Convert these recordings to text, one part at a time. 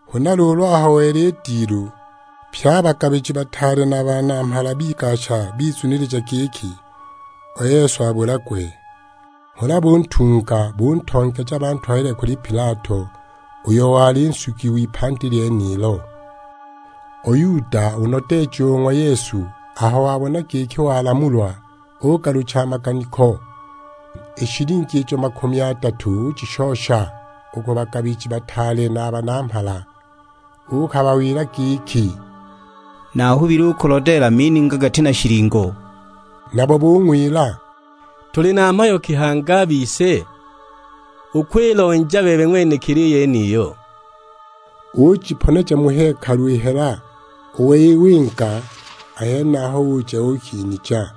Huna luulu aho wela i dilu, pye a bagabiji bataale na a banamhala bigasha, bizunilija giki u Yesu abulagwe. Huna buntunga, buntongeja bantwalile kuli Pilato, uyo wali nsugi w'ipandi lyenilo. U Yuda, u nodeeji o ng'wa Yesu, aho wabona giki walamulwa, ugalucha a maganiko. I shilingi ijo makumi adatu ujishosha u ku bagabiji bataale na a banamhala. Uukabawila giki, "Naahubile u kulodeela mininga gati na shilingo!" Nabo bung'wila, "Tuli na mhayo ki hangi a bise? Ukwilonja bebe ng'wenekili i yeniyo!" Ujiponeja mu hekalu i hela, u wei winga a henaho uja uukinija!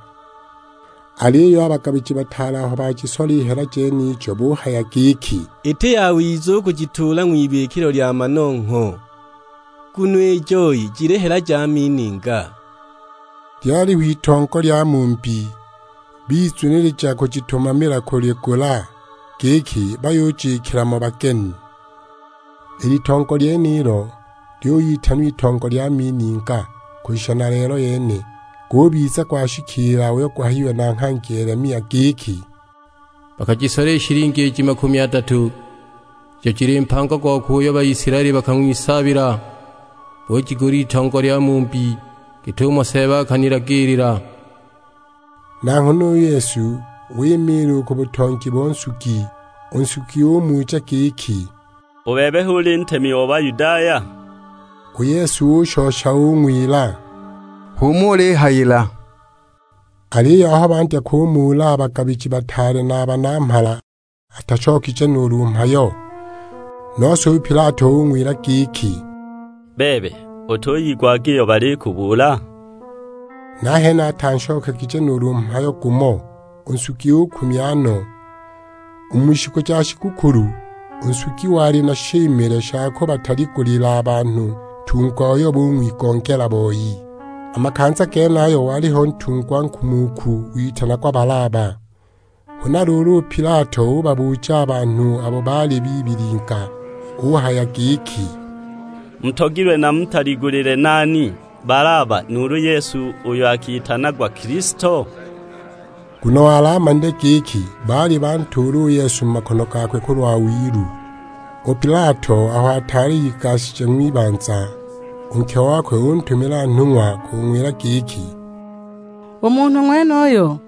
Aliyo a bagabiji bataale aho bajisola i hela jenijo buhaya giki, "Iti yawiza u kujituula ng'wibikilo lya manongho, nguno i joi jili hela ja mininga." Lyaliho itongo lya mumbi, bizunilija kujitumamila kuligula, giki bayujikila mo bageni. I litongo lyenilo lyuyitanwa Itongo lya mininga, kushisha na lelo yene. Gubiza gwashikiila uyo guhayiwe na nghangi Yelemia; giki, "Bakajisola i shilingi iji makumi adatu, ijo jili mpango gokwe uyo Baisilaeli bakang'wisaabila, bujigula itongo lya mumbi git'umo Seeba akanilagiilila." Na nghana u Yesu wimiila u ku butongi bo nsugi; u nsugi umuja giki, "U bebe hu uli ntemi o Bayudaya?" U Yesu ushosha ung'wila, "H'umo ulihayila!" Aliyo aho bandya kumuula a bagabiji bataale na a banamhala, atashokije nuulu mhayo! Nose u Pilato ung'wila giki, "Bebe, utuyigwaga iyo balikubuula?" Nahene atanshokegije nuulu mhayo gumo; u nsugi ukumya no! U mu shiku ja shigukulu, u nsugi wali na shimile sha kubataligulila a banhu ntungwa uyo bung'wigongela boi. A makanza genayo waliho ntungwa nkumuku witanagwa Balaba. Huna luulu u Pilato ubabuja a banhu abo baali bibilinga; uhaya giki, "Mutogilwe namutaligulile nani? Balaba, nuulu u Yesu uyo akitanagwa Kilisto?" Nguno wali amanile giki baali bantuula u Yesu mu makono gakwe kulwa wilu. U Pilato aho ataali igashije u ng'wibanza, u nke okwe untumila nhung'wa kung'wila giki, "U munhu ng'wenuyo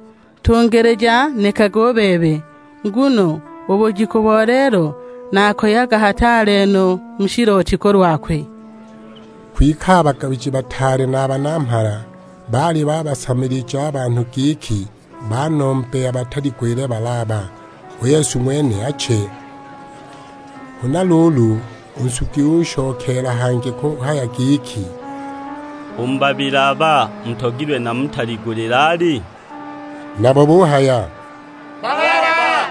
ntungilija nekage u bebe. Nguno u bujiku bo lelo nakoyaga hataale no mu shilooti kulwakwe." Kwike a bagabiji bataale na a banamhala, baali babasamilija a banhu giki banombe abataligulile Balaba, u Yesu ng'wene ache! Huna luulu u nsugi ushokeela hangi kuhaya giki, "U mu babili aba, mutogilwe namutaligulile ali?" Nabo buhaya, "Balaba!"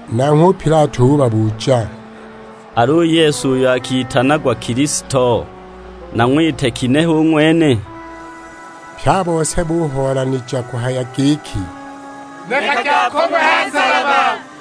Nanghwe u Pilato ubabuja, "Al'u Yesu uyo akitanagwa Kilisto, nang'wite ginehe u ng'wene?" Pye a bose buhoolanija kuhaya giki; "Nekage akong'we ha nsalaba!"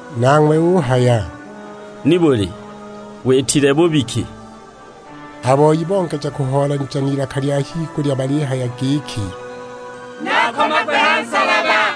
Nanghwe uhaya, "Nibuli, witile bubi ki?" A boi bongeja kuhoolanija n'ilaka lya higulya balihaya giki, "Ni akomagwe ha nsalaba!"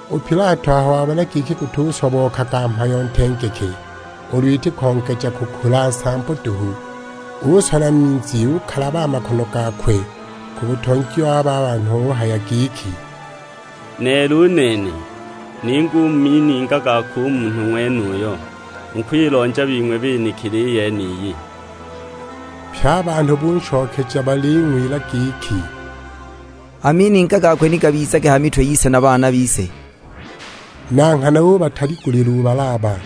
U Pilato aho wabona giki gutusobookaga mhayo ntengeke, ulu iti kongeja kukula nsambo duhu, usola minzi ukalaba a makono gakwe ku butongi wabo a banhu; uhaya giki, "Neela u nene, ninga u mu mininga gakwe u munhu ng'wenuyu, mukwilonja bing'we benekili i yeniyi!" Pye a banhu bunshokeja baling'wila giki, "A mininga gakwe ni gabizage ha mitwe yise na baana bise!" Na nghana ubataligulila u Balaba.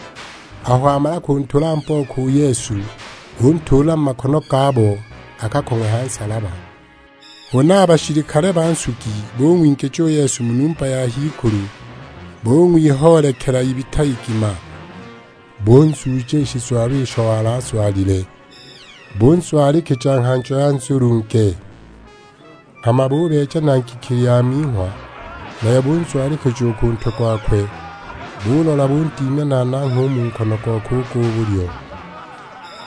Aho wamala kuntula mbooko u Yesu, untuula mu makono gabo akakong'we ha nsalaba. Huna a bashilikale ba nsugi bung'wingija u Yesu mu numba ya h'ikulu, bung'wihoolekela ibita igima. Bunzuuja i shizwalo isho wali azwalile, bunzwalikija nghanjo ya nzulunge. Hama bubeeja na ngikili ya minghwa, nayo bunzwalikija u ku ntwe gokwe, bulola bundimya na nangha u mu nkono gokwe u gwa bulyo;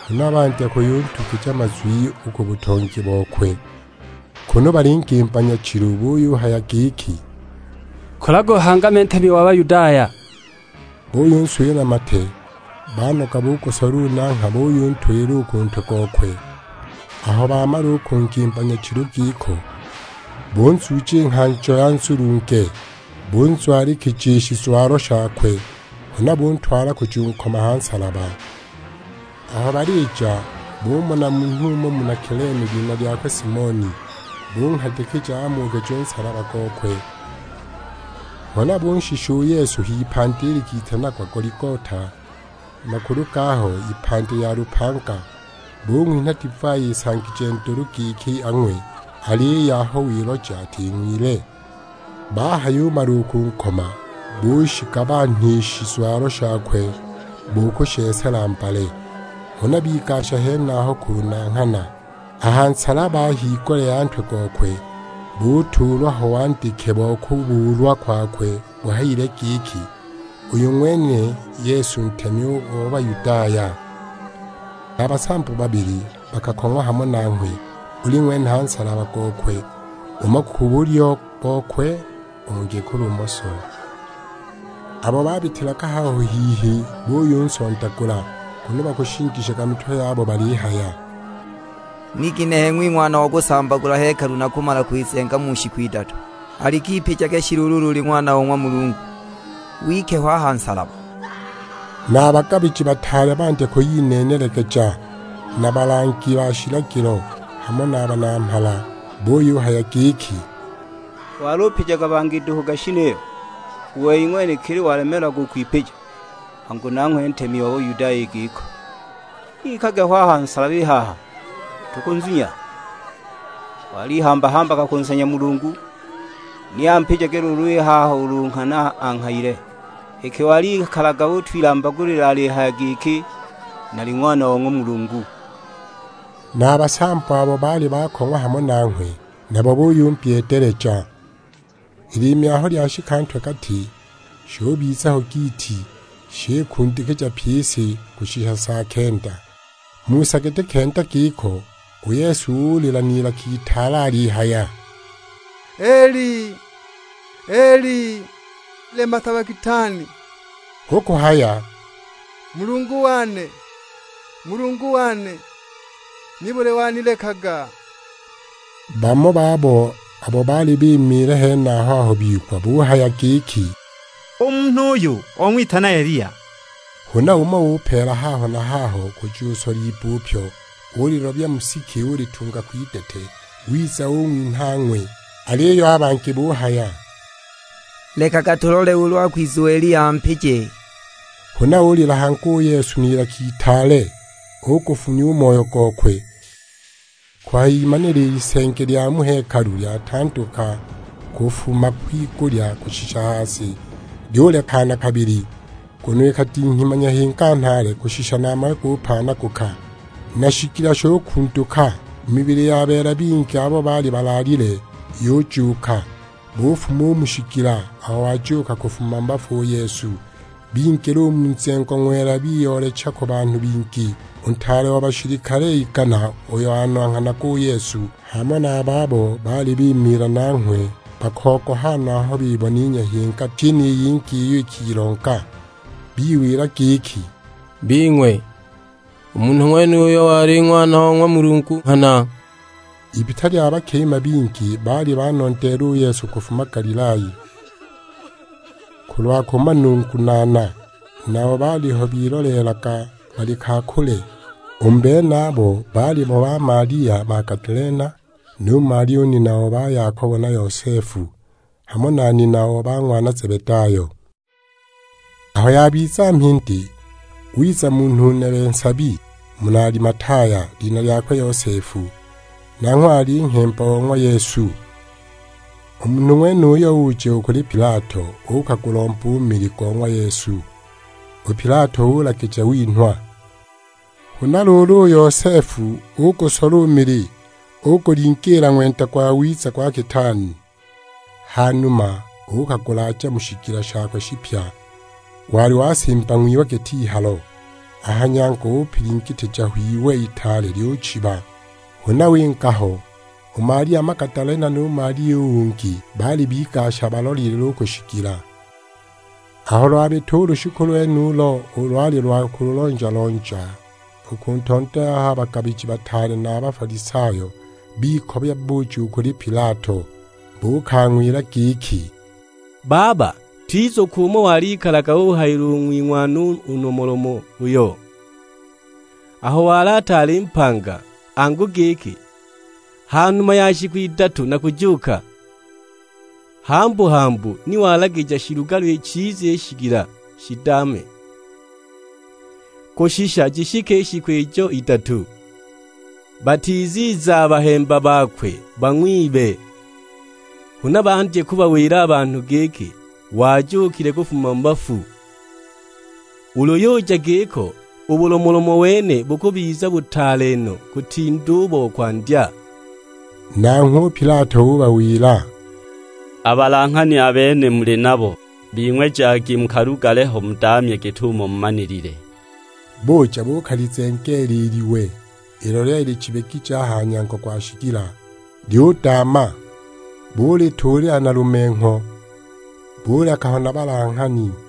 huna bandya kuyuntugija mazwi u ku butongi bokwe, kunu balingimba nyachilu; buyuhaya giki, "Kulaga uhangame ntemi o Bayudaya!" Buyunswila na mate; banoga bugusola u nangha buyuntulila u ku ntwe gokwe! Aho bamala u kungimba nyachilu giko, bunzuuja i nghanjo ya nzulunge, bunzwalikija i shizwalo shakwe. Huna buntwala kujunkoma ha nsalaba! Aho balija, bumona munhu umo muna Kilene, lina lyakwe Simoni. Bunghadikija amuukije u nsalaba gokwe. Huna bunshisha u Yesu h'ipandi likitanagwa Goligota, makulu gaho ipandi lya lupanga. Bung'winha divai isangije ndulu giki ang'we; aliyo aho wiloja ating'wile. Bahayumala u kunkoma bushigabanha i shizwalo shakwe bo kushesela mbale. Huna bigasha henaho kunanghana. A ha nsalaba a higulya ya ntwe gokwe, butuulwa ho wandike bo kubuulwa kwakwe buhayile giki, "UYU NG'WENE YESU NTEMI O BAYUDAYA" Na basambo babili bakakong'wa hamo nanghwe, buli ng'wene ha nsalaba gokwe, umo ku bulyo bokwe, ungi ku lumoso. Abo babitilaga haho hihi buyunsondagula, kunu bakushingishaga mitwe yabo; balihaya, "Ni ginehe ng'wing'wana o kusambagula hekalu na kumala kwizenga mu shiku idatu. Alik'ipijage shi luulu ulu uli Ng'wana o ng'wa Mulungu, wike ho a ha nsalaba!" Na a bagabiji bataale bandya kwiyineenelegeja na balangi ba shilagilo, hamo na banamhala. Buyuhaya giki, "Walupijaga bangi duhu gashi niyo, u wei ng'wenekili walemeelagwa u kwipija. Angu nanghwe ntemi o Bayudaya i giko, ni ikage ho a ha nsalaba i haha, tukunzunya! Walihamba-hambaga kunsanya Mulungu, ni ampijage luulu i haha ulu nghana anghayile. Iki walikalaga utwilambagulila alihaya giki, 'Nali Ng'wana o ng'wa Mulungu!' " Na a basambo, abo baali bakong'wa hamo nanghwe, nabo buyumbyeedeleja! I liimi aho lyashika ntwe-gati, shubiza ho giiti; shikundikija pyi i si, kushisha sa kenda. Mu sa giti kenda giko, u Yesu ulila n'ilaka itaale alihaya, "Eli, Eli, lema sabaktani?" Hu kuhaya, "Mulungu wane, Mulungu wane, nibuli wanilekaga?" Bamo babo abo baali bimiila henaho aho bigwa buhaya giki, "U munhu uyu ong'witana Eliya!" Huna umo upeela haho na haho kujusola ibbupyo, ulilobya mu siki ulitunga kwidete, wiza ung'winha ang'we. Aliyo a bangi buhaya, "Lekaga tulole ulu akwiza u Eliya ampije!" Huna ulila hangi u Yesu n'ilaka itaale; ugufunya u moyo gokwe! Kuhayimanila i lisenge lya mu hekalu lyatanduka kufuma kwigulya kushisha ha si, lyulekana habili; nguno ikadinghima nyahinga nhaale kushisha na mawe gupaanaguka. Na shigila shukunduka, mibili ya beela bingi abo baali balaalile yujuuka. Bufuma u mu shigila, aho wajuuka kufuma mu bafu u Yesu, bingila u mu nzengo ng'wela biyoolecha ku banhu bingi. U ntaale o bashilikale igana uyo onanghanaga u Yesu, hamo na a babo baali bimiila nanghwe bakogoha no aho bibona i nyahinga pyi ni yingi iyo ikilonga. Biwila giki, "Bing'we, u munhu ng'wenuyu wali Ng'wana o ng'wa Mulungu nghana!" Ibita lya bakima bingi baali banondeela u Yesu kufuma Galilaya, kulwa kumanungunaana; nabo baaliho biloleelaga bali ka kule. U mu benabo baalimo ba Malia Magadalena, nu Malia u nina o ba Yakobo na Yosefu; hamo na nina o ba ng'wana Zebedayo. Aho yabiza mhindi, wiza munhu nebe nsabi, muna Alimataya, lina lyakwe Yosefu; nanghwe wali nghemba o ng'wa Yesu. U munhu ng'wenuyo uja u kuli Pilato uukagulomba u mili go ng'wa Yesu; u Pilato ulagija winhwa. Huna luulu u Yosefu ugusola u mili, ugulingiila ng'wenda gwawiza gwa kitaani. Hanuma uukagulaaja mu shigila shakwe shipya, wali wasimba ng'wiwe git'ihalo; a ha nyango upilingitija ho iwe itaale lyuchiba; huna winga ho. U Malia Magadalena nu Malia u ungi, baali bigasha balolelile u ku shigila. Aho lwabita u lushiku lwenulo, ulo lwali lwa kulonja-lonja, u ku ntondo yaho a bagabiji bataale na a Bafalisayo bikobya buja u kuli Pilato. Buukang'wila giki, "Baba, twizukwa umo walikalaga uhayila u ng'wing'wana u nomolomo uyo, aho wali ataali mpanga, angu giki, 'Ha numa ya shiku idatu nakujuuka!' Hambu-hambu ni walagija shilugalwe chiza i shigila shidaame, kushisha jishike i shiku ijo idatu. Batiziza a bahemba bakwe bang'wibe, huna bandye kubawila a banhu giki, wajuukile kufuma mu bafu. Ulu yuja giko u bulomolomo wene bukubiza butaale no, kutinda u bo kwandya!" Nanghwe u Pilato ubawila, "A balanghani a bene muli nabo, bing'we jagi mukalugale ho mudaamye git'umo mumanilile." Buja buukalizengeela i liwe, ilo lyali lichibigije a ha nyango gwa shigila, lyudaama. Bulituulila na lumengho, buleka ho na balanghani.